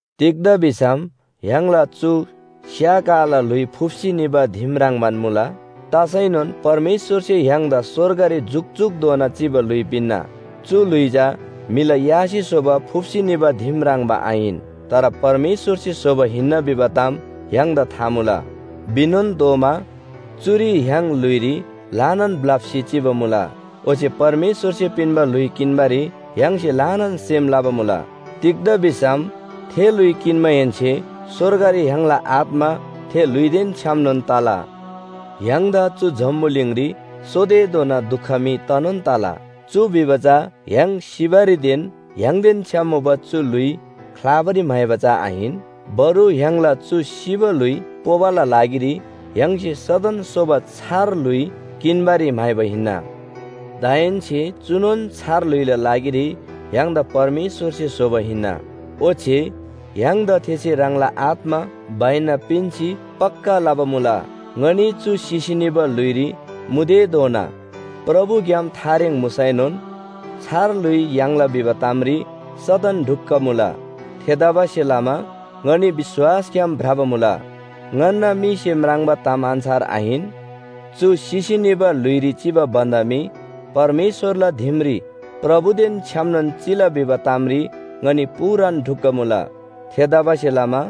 तिग्‍दा भिसम य्‍हाङला चु स्‍या काला ल्‍हुइ फुप्‍सी निबा दिम ह्रङ्‌बान मुला। तसैनोन परमेश्‍वरसे य्‍हाङदा स्‍वर्गरी जुकजुकधोना चिबा ल्‍हुइ पिन्‍ना। चु ल्‍हुइ चा म्‍हिला यासे स्‍होबा फुप्‍सी निबा दिम ह्रङ्‌बा आहिन, तर परमेश्‍वरसे स्‍होबा हिन्‍ना भिबा ताम य्‍हाङदा था मुला। भिनोन तोःमा चुरी य्‍हाङ ल्‍हुइरी ल्‍हानान ब्‍लप्‍सी चिबा मुला। ओच्‍छे परमेश्‍वरसे पिन्‍बा ल्‍हुइ किन्‍बारी य्‍हाङसे ल्‍हानान सेम लबा मुला। तिग्‍दा भिसम थे ल्‍हुइ किन्‍माहेन्‍से स्‍वर्गरी य्‍हाङला आत्‍मा थे ल्‍हुइदेन छ्‌यामनोन तला। य्‍हाङदा चु जम्‍बुलिङरी सोतेधोना दुख मी तनोन तला। चु भिबा चा य्‍हाङ सिबारीदेन य्‍हाङदेन छ्‌याम मुबा चु ल्‍हुइ ख्‍लाबारी म्‍हाइबा चा आहिन। बरु य्‍हाङला चु सिबा ल्‍हुइ पोबाला लागिरी य्‍हाङसे सदन सोबा छार ल्‍हुइ किन्‍बारी म्‍हाइबा हिन्‍ना। दाहेन्‍से चुनोन छार ल्‍हुइला लागिरी य्‍हाङदा परमेश्‍वरसे स्‍होबा हिन्‍ना। ओच्‍छे य्‍हाङदा थेसे ह्राङला आत्‍मा बैना पिन्‍सी पक्‍का लबा मुला। ङनी चु सिसी निबा ल्‍हुइरी मुतेधोना प्रभुग्‍याम थारेङ मुसैनोन छार ल्‍हुइ याङ्ला भिबा तामरी सदन ढुक्‍क मुला। थेतबासेलमा ङनी विश्‍वासग्‍याम भ्रबा मुला, ङन्‍ना मीसे म्राङ्बा ताम अन्‍छार आहिन। चु सिसी निबा ल्‍हुइरी चिबा भन्‍दा मी परमेश्‍वरला दिमरी प्रभुदेन छ्‌यामनोन चिला भिबा तामरी ङनी पूरान ढुक्‍क मुला। थेतबासेलमा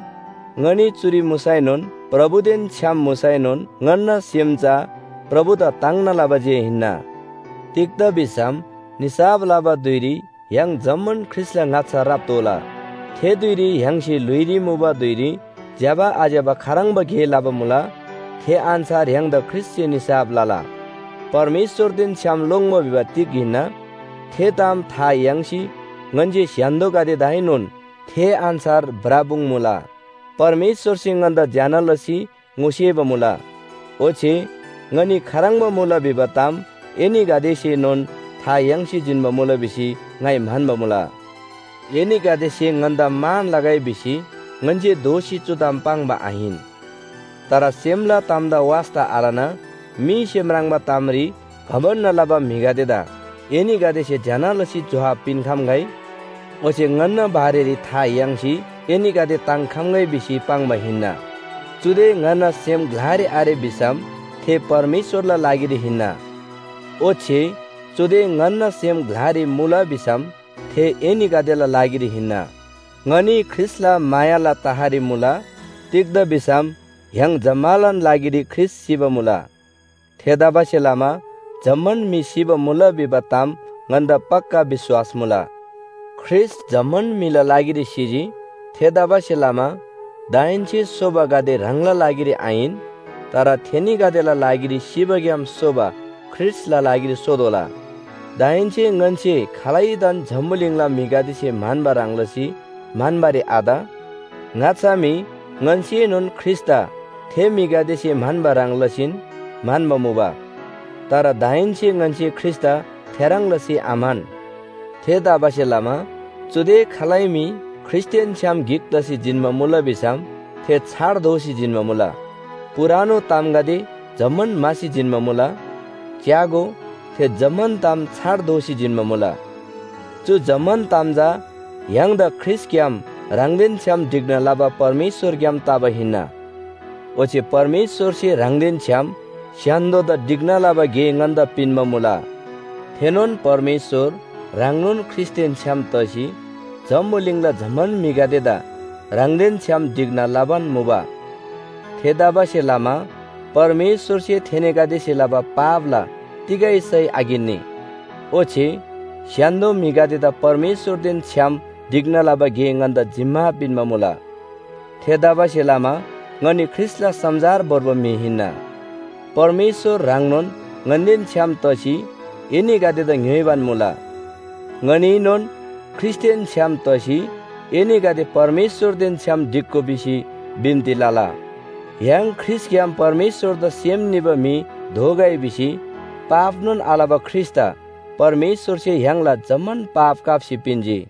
ङनी चुरी मुसैनोन, प्रभुदेन छ्‌याम मुसैनोन ङन्‍ना सेम चा प्रभुदा ताङ्ना लबा जे हिन्‍ना। तिग्‍दा भिसम निसाफ लबा धुइरी य्‍हाङ जम्‍मान ख्रीष्‍टला ङाच्‍छा राप्‍तोःला। थे धुइरी य्‍हाङसे ल्‍हुइरी मुबा धुइरी ज्‍यबा आज्‍यबा खाह्रङ्बा गे लबा मुला, थे अन्‍छार य्‍हाङदा ख्रीष्‍टसे निसाफ लला। परमेश्‍वरदेन छ्‌याम लोङ्‌बा भिबा तिग हिन्‍ना, थे ताम था याङ्सी ङन्‍से स्‍य्‍हान्‍दोगदेदाएनोन थे अन्‍छार भ्रपुङ्मुला। परमेश्‍वरसे ङन्‍दा ज्‍यना लसी ङोसेबा मुला। ओच्‍छे ङनी खाह्रङ्बा मुला भिबा ताम एनीगदेसेनोन था याङ्सी जिन्‍बा मुला भिसी ङाइ म्‍हन्‍बा मुला। एनीगदेसे ङन्‍दा मान लगै भिसी ङन्‍से दोःसी चु ताम पाङ्बा आहिन। तर सेमला तामदा वास्‍ता आलना मीसे म्राङ्बा तामरी घमण्‍ड लबा म्‍हिगदेदा एनीगदेसे ज्‍यना लसी जोहाब पिन्‍खम्‍गै, ओच्‍छे ङन्‍ना बारेरी था याङ्सी एनीगदे ताङ्‍खम्‍गै भिसी पाङ्बा हिन्‍ना। चुदे ङन्‍ना सेम ग्‍लारी आरे भिसम थे परमेश्‍वरला लागिरी हिन्‍ना, ओच्‍छे चुदे ङन्‍ना सेम ग्‍लारी मुला भिसम थे एनीगदेला लागिरी हिन्‍ना। ङनी ख्रीष्‍टला मायाला तहरी मुला, तिग्‍दा भिसम य्‍हाङ जम्‍मालान लागिरी ख्रीष्‍ट सिबा मुला। थेतबासेलमा जम्‍मान म्‍हि सिबा मुला भिबा ताम ङन्‍दा पक्‍का विश्‍वास मुला। ख्रीष्‍ट जम्‍मान म्‍हिला लागिरी सिजी। थेतबासेलमा दाहेन्‍से सोबागदे ह्राङला लागिरी आहिन, तर थेनीगदेला लागिरी सिबाग्‍याम सोबा ख्रीष्‍टला लागिरी सोतोःला। दाहेन्‍से ङन्‍से खालैदान जम्‍बुलिङला म्‍हिगदेसे म्‍हन्‍बा ह्रङ् लसी म्‍हन्‍बारी आत। ङाच्‍छा मी ङन्‍सेनोन ख्रीष्‍टदा थे म्‍हिगदेसे म्‍हन्‍बा ह्रङ् लसीन म्‍हन्‍बा मुबा। तर दाहेन्‍से ङन्‍से ख्रीष्‍टदा थेह्रङ् लसी आम्‍हन। थेतबासेलमा चुदे खालै म्‍हि ख्रीष्‍टदेन छ्‌याम गिक तसी जिन्‍बा मुला भिसम थे छार दोसी जिन्‍बा मुला, पुरानो तामगदे जम्‍मान म्‍हासी जिन्‍बा मुला। च्‍यागो, थे जम्‍मान ताम छार दोसी जिन्‍बा मुला। चु जम्‍मान ताम चा य्‍हाङदा ख्रीष्‍टग्‍याम ह्राङदेन छ्‌याम ढिक्‍ना लबा परमेश्‍वरग्‍याम तबा हिन्‍ना। ओच्‍छे परमेश्‍वरसे ह्राङदेन छ्‌याम स्‍य्‍हान्‍दोदा ढिक्‍ना लबा गे ङन्‍दा पिन्‍बा मुला। थेनोन परमेश्‍वर ह्राङनोन ख्रीष्‍टदेन छ्‌याम तसी जम्‍बुलिङला जम्‍मान म्‍हिगदेदा ह्राङदेन छ्‌याम ढिक्‍ना लबान मुबा। थेतबासेलमा परमेश्‍वरसे थेनीगदेसे लबा पापला तिगै सय आकिन्‍नी। ओच्‍छे स्‍य्‍हान्‍दो म्‍हिगदेदा परमेश्‍वरदेन छ्‌याम ढिक्‍ना लबा गे ङन्‍दा जिम्‍मा पिन्‍बा मुला। थेतबासेलमा ङनी ख्रीष्‍टला समाचार भोर्बा म्‍हि हिन्‍ना। परमेश्‍वर ह्राङनोन ङन्‍देन छ्‌याम तसी एनीगदेदा ङ्‍योइबान मुला। ङनीएनोन ख्रीष्‍टदेन छ्‌याम तसी एनीगदे परमेश्‍वरदेन छ्‌याम ढिक्‍गो भिसी बिन्‍ती लला। य्‍हाङ ख्रीष्‍टग्‍याम परमेश्‍वरदा सेम निबा म्‍हि दोगै भिसी पापनोन आलबा ख्रीष्‍टदा परमेश्‍वरसे य्‍हाङला जम्‍मान पाप काप्‍सी पिन्‍जी।